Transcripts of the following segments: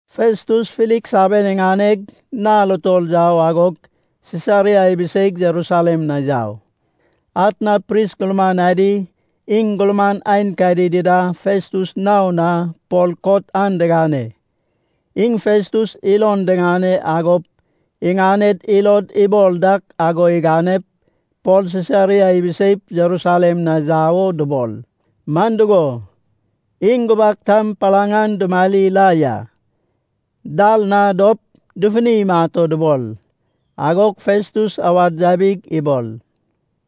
Festus Filiks aben iŋaneg nal utol yau, agog Sisaria ibiseig Jerusalem na yau. Atna pris gurman adi, iŋ gurman aenkadi dida Festus nao na Pol kot an digane. Iŋ Festus ilon diŋane, agop iŋaned ilod ibol dak ago iganep Pol Sisaria ibiseip Jerusalem na yau o dubol. Man dugo, iŋ gubak tam palaŋ an dumari la ya. Dal na dop dufuni imat o dubol. Agog Festus awad yabig ibol,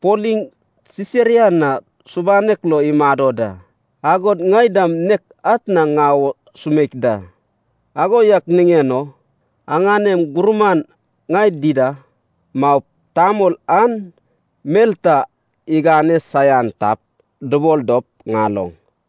“Pol iŋ Sisaria na subanek lo imado da. Agod ŋai dam nek atna ŋau o sumeik da. Ago yak niŋen o aŋanem gurman ŋai dida maup, tamol an mel ta igane saian tap, dubol dop ŋaloŋ.”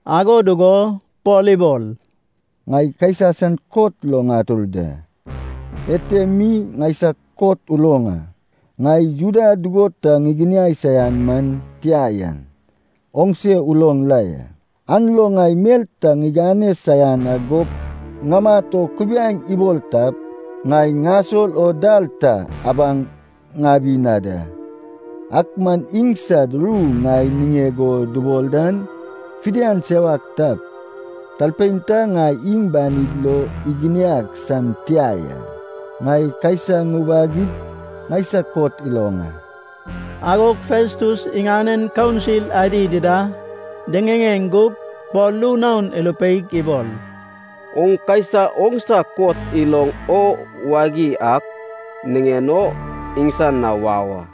Ago dugo Pol ibol, “Ŋai Kaisa san kot lo ŋatur da. Ete mi ŋaisag kot uloŋ a. Ŋai Juda dugo ta ŋiginiai saian man tia yan oŋse uloŋ la ya. An lo ŋai mel ta ŋigane saian agop ŋamat o kubiaeŋ ibol tap, ŋai ŋasol o dal ta abaŋ ŋabi na da. Ak man iŋsad ru ŋai niŋeg o dubol dan, fidian sewak tap, talpein ta ŋai iŋ banid lo iginiag san tia ya. Ŋai Kaisa ŋuwagip ŋaisag kot iloŋ a.” Agog Festus iŋanen kaunsil adi dida diŋiŋeŋ gug Pol ru naon irupeig ibol, “Oŋ Kaisa oŋsa kot iloŋ o wagi ak niŋen o iŋsan na wau a.”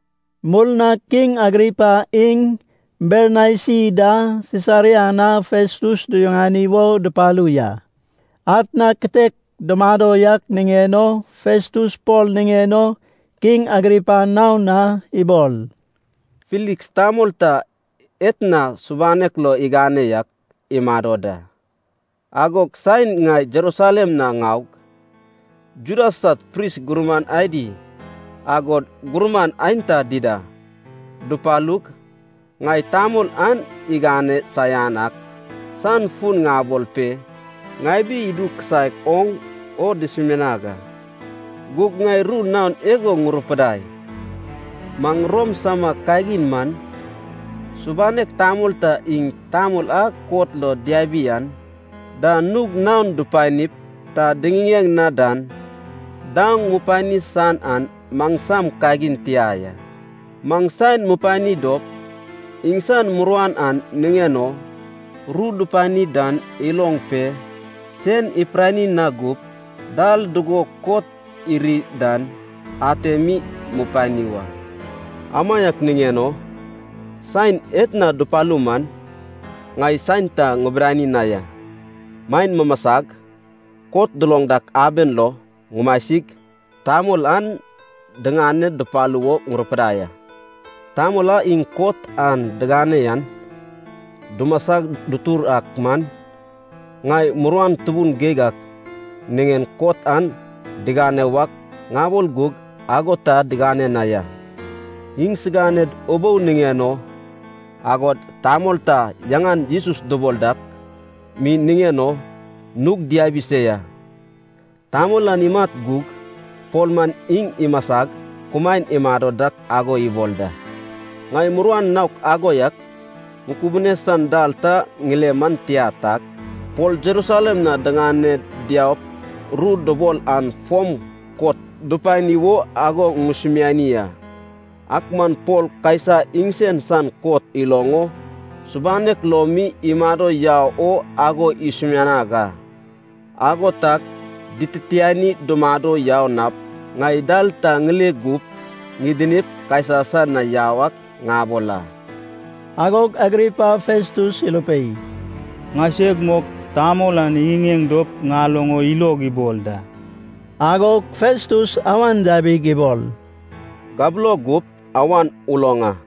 Murnag Kiŋ Agripa iŋ Bernaisi da Sisaria na Festus duyuŋani wo dupalu ya. Atna kitek dumado yak niŋen o Festus Pol niŋen o Kiŋ Agripa naon na ibol, “Filiks tamol ta etna subanek lo igane yak imado da. Agog saen ŋai Jerusalem na ŋaug, Juda sad pris gurman adi, agod gurman aenta dida dupalug, ŋai tamol an igane saian ak san fun ŋabol pe ŋabi idu kisaek oŋ o dusumianag a. Gug ŋai ru naon igo ŋurupidai. Maŋ Rom sama kagin man, subanek tamol ta iŋ tamol a kot lo diabi an da nug naon dupanip ta diŋiŋeŋ na dan daoŋ mupani san an maŋsam kagin tia ya. Maŋ saen mupani dop, iŋsan muruan an niŋen o ru dupani dan iloŋ pe, sen ipirani na gup, dal dugo kot iri dan ate mi mupani wa. Amaiak niŋen o saen etna dupalu man, ŋai saen ta ŋibidani na ya. Maen mumasag kot duloŋ dak aben lo ŋumasig, tamol an diŋane dupalu wo ŋurupidai a. Tamol a iŋ kot an digane yan dumasa dutur ak man, ŋai muruan tubun geig ak niŋen kot an digane wak ŋabol gug ago ta digane na ya. Iŋsiganed ubou niŋen o, agod tamol ta yaŋan Jesus dubol dak mi niŋen o nug diabi se ya. Tamol an imat gug Pol man iŋ imasag kumaen imado dak ago ibol da. Ŋai muruan naok ago yak ŋukubune san dal ta ŋile man tia tag, Pol Jerusalem na diŋane diaup ru dubol an fom kot dupani wo ago ŋusumiani a. Ak man Pol Kaisa iŋsen san kot iloŋ o subanek lo mi imado yau o ago isumianag a. Ago tag dititiani dumado yau nap ŋai dal ta ŋile gup ŋidinip Kaisa san na yau ak ŋabol a.” Agog Agripa Festus irupei, “Ŋaiseg mok tamol an iŋiŋeŋ dop ŋaloŋ o ilog ibol da.” Agog Festus awan yabig ibol, “Gabulo gup awan uloŋ a.”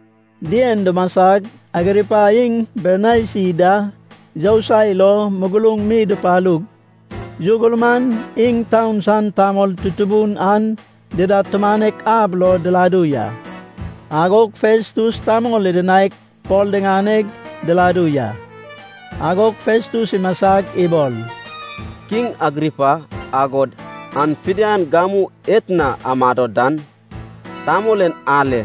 Dien dumasag Agripa iŋ Bernaisi da yousai lo muguruŋ mi dupalug, yu gurman, iŋ taun san tamol tutubun an dida tumanek ab lo diladu ya. Agog Festus tamol idinaig Pol diŋaneg diladu ya. Agog Festus imasag ibol, “Kiŋ Agripa, agod aŋ fidian gamu etna amado dan, tamol en ale,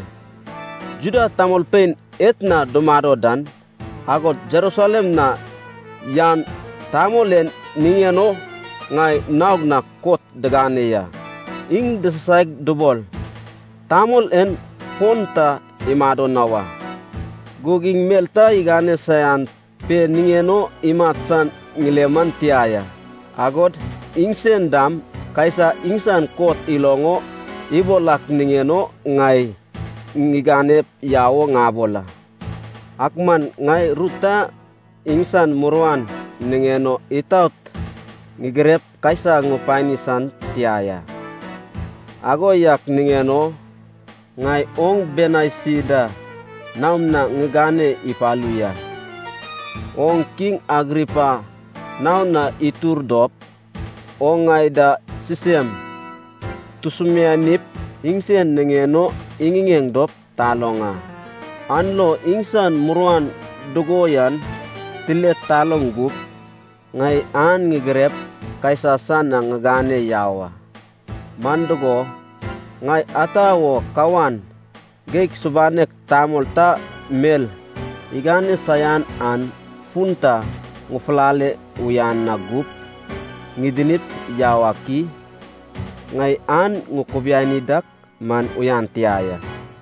Juda tamolpein etna dumado dan, agod Jerusalem na yan tamol en niŋen o ŋai naog na kot digane ya. Iŋ disasaig dubol, ‘Tamol en fon ta imado na wa.’ Gug iŋ mel ta igane saian pe niŋen o imat san ŋile man tia ya. Agod iŋsen dam Kaisa iŋsan kot iloŋ o ibol ak niŋen o ŋai ŋiganep yau o ŋabol a. Ak man ŋai ru ta iŋsan muruan niŋen o itaot ŋigirep Kaisa ŋupani san tia ya. Ago yak niŋen o ŋai oŋ Bernaisi da naom na ŋigane ipalu ya. Oŋ kiŋ Agripa nao na itur dop oŋ ŋai da sisem tusumianip, iŋsen niŋen o iŋiŋeŋ dop taloŋ a. An lo iŋsan muruan dugo yan tile taloŋ gup, ŋai an ŋigirep Kaisa san na ŋigane yau a. Man dugo, ŋai ata wo kawan geig subanek tamol ta mel igane saian an fun ta ŋufulale uyan na gup ŋidinip yau ak i? Ŋai an ŋukubiani dak man uyan tia ya.”